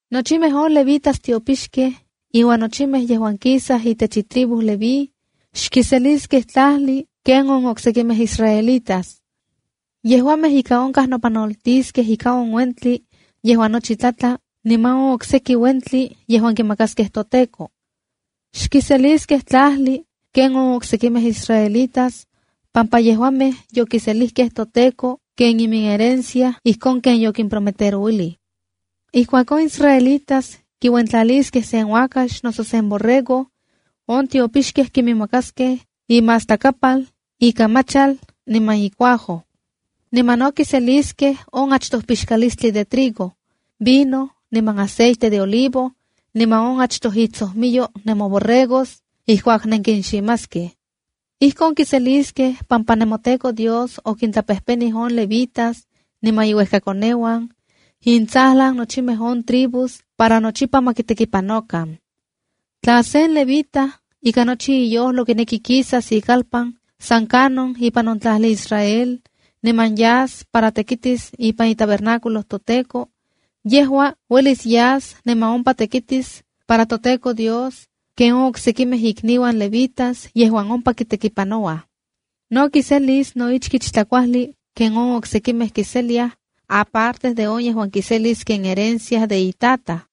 ’Nochimej on levitas tiopixkej iuan nochimej yejuan kisaj itech itribu leví, xkiseliskej tlajli ken on oksekimej israelitas. Yejuamej ika onkaj nopanoltiskej ika on uentli yejuan nochi tlatla niman on okseki uentli yejuan kimakaskej toTEKO. Xkiseliskej tlajli ken on oksekimej israelitas, pampa yejuamej yokiselijkej toTEKO ken iminherencia ijkon ken yokimprometerouilij. ’Ijkuak on Israelitas kiuentlaliskej sen uakax noso sen borrego, on tiopixkej kiminmakaskej imastlakapal, ikamachal, niman icuajo. Niman no kiseliskej on achtoj pixkalistli de trigo, vino niman aceite de olivo, niman on achtoj itsojmiyo nemoborregos ijkuak nenkinximaskej. Ijkon kiseliskej pampa nemoTEKO Dios okintlapejpenij on levitas niman inuejkakoneuan, intsajlan nochimej on tribus para nochipa ma kitekipanokan. ’Tla sen levita ikan nochi iyojlo kineki kisas ikalpan san kanon ipan on tlajli Israel, niman yas para tekitis ipan itabernáculo toTEKO, yejua uelis yas niman ompa tekitis para toTEKO Dios ken on oksekimej ikniuan levitas yejuan ompa kitekipanouaj. Niman kiselis no ichkich tlakuajli ken on oksekimej kiseliaj aparte de on yejuan kiselis ken herencia de itataj.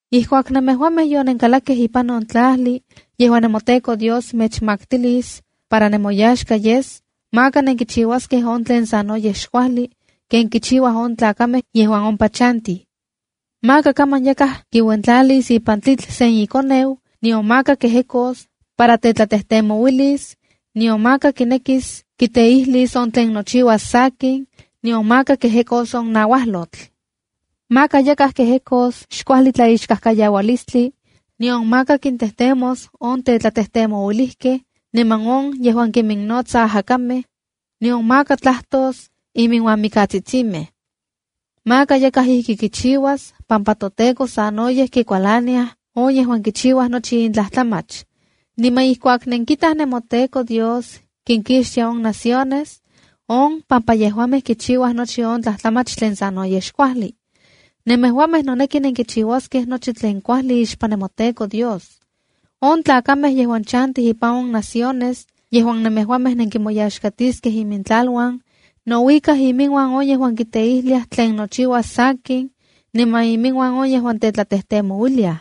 ’Ijkuak nemejuamej yonenkalakkej ipan on tlajli yejuan nemoTEKO Dios mechmaktilis para nemoyaxka yes, maka nenkichiuaskej on tlen sanoyej xkuajli ken kichiuaj on tlakamej yejuan ompa chantij. Maka kaman yakaj kiuentlalis ipan tlitl sen ikoneu, nion maka kejekos para tetlatejtemouilis, nion maka kinekis kiteijlis on tlen nochiuas sakin, nion maka kejekos on nauajlotl. Maka yakaj kejekos xkuajli tlaixkajkayaualistli, nion maka kintejtemos on tetlatejtemouilijkej niman on yejuan kiminnotsaj ajakamej, nion maka tlajtos iminuan mikatsitsimej. Maka yakaj ijki kichiuas pampa toTEKO sanoyej kikualaniaj on yejuan kichiuaj nochi in tlajtlamach. Niman ijkuak nenkitaj nemoTEKO Dios kinkixtia on naciones, on pampa yejuamej kichiuaj nochi on tlajtlamach tlen sanoyej xkuajli. Nemejuamej noneki nenkichiuaskej nochi tlen kuajli ixpan nemoTEKO Dios. On tlakamej yejuan chantij ipan on naciones yejuan nemejuamej nenkimoyaxkatiskej imintlaluan, nouikaj iminuan on yejuan kiteijliaj tlen nochiuas sakin niman iminuan on yejuan tetlatejtemouiliaj.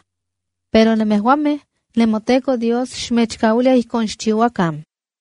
Pero nemejuamej, nemoTEKO Dios xmechkauilia ijkon xchiuakan.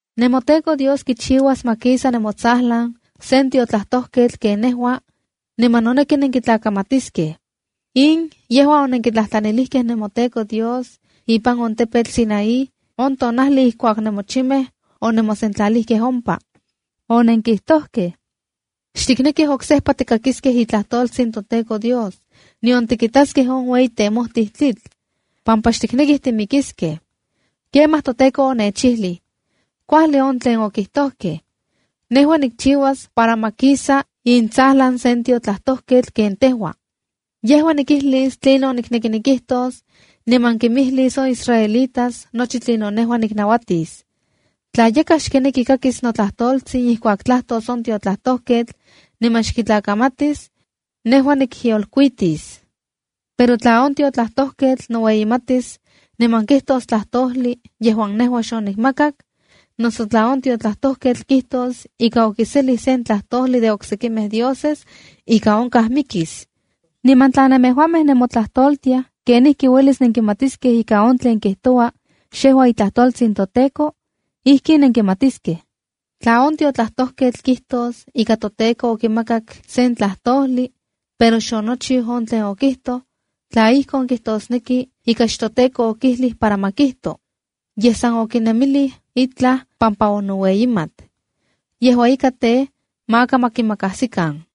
’NemoTEKO Dios kichiuas ma kisa nemotsajlan sen tiotlajtojketl ken nejua, niman noneki nenkitlakamatiskej. In yejua onenkitlajtlanilijkej nemoTEKO Dios ipan on tepetl Sinaí on tonajli ijkuak nemochimej onemosentlalijkej ompa. Onenkijtojkej: “Xtiknekij oksejpa tikakiskej itlajtoltsin toTEKO Dios, nion tikitaskej on ueyi temojtij tlitl, pampa xtiknekij timikiskej.” ’Kemaj toTEKO onechijlij: “Kuajli on tlen okijtojkej. Nejua nikchiuas para ma kisa intsajlan sen tiotlajtojketl ken tejua. Yejua nikijlis tlinon noneki kijtos, niman kimijlis on israelitas nochi tlinon nejua niknauatis. Tla yakaj xkineki kakis notlajtoltsin ijkuak tlajtos on tiotlajtojketl niman xkitlakamatis, nejua nikyolkuitis. Pero tla on tiotlajtojketl noueyimatis niman kijtos tlajtojli yejuan nejua xonikmakak, noso tla on tiotlajtojketl kijtos ika okiselij sen tlajtojli de oksekimej dioses, ika onkaj mikis.” Niman tla nemejuamej nenmotlajtoltiaj kenijki uelis nenkimatiskej ika on tlen kijtoua, xejua itlajtoltsin toTEKO, ijkin nenkimatiskej. Tla on tiotlajtojketl kijtos ika toTEKO okimakak sen tlajtojli, pero xonochiu on tlen okijtoj, tla ijkon, kijtosneki ika xtoTEKO okijlij para ma kijto, yej san okinemilij itlaj pampa onoueyimat. Yejua ika tej, maka ma kimakajsikan.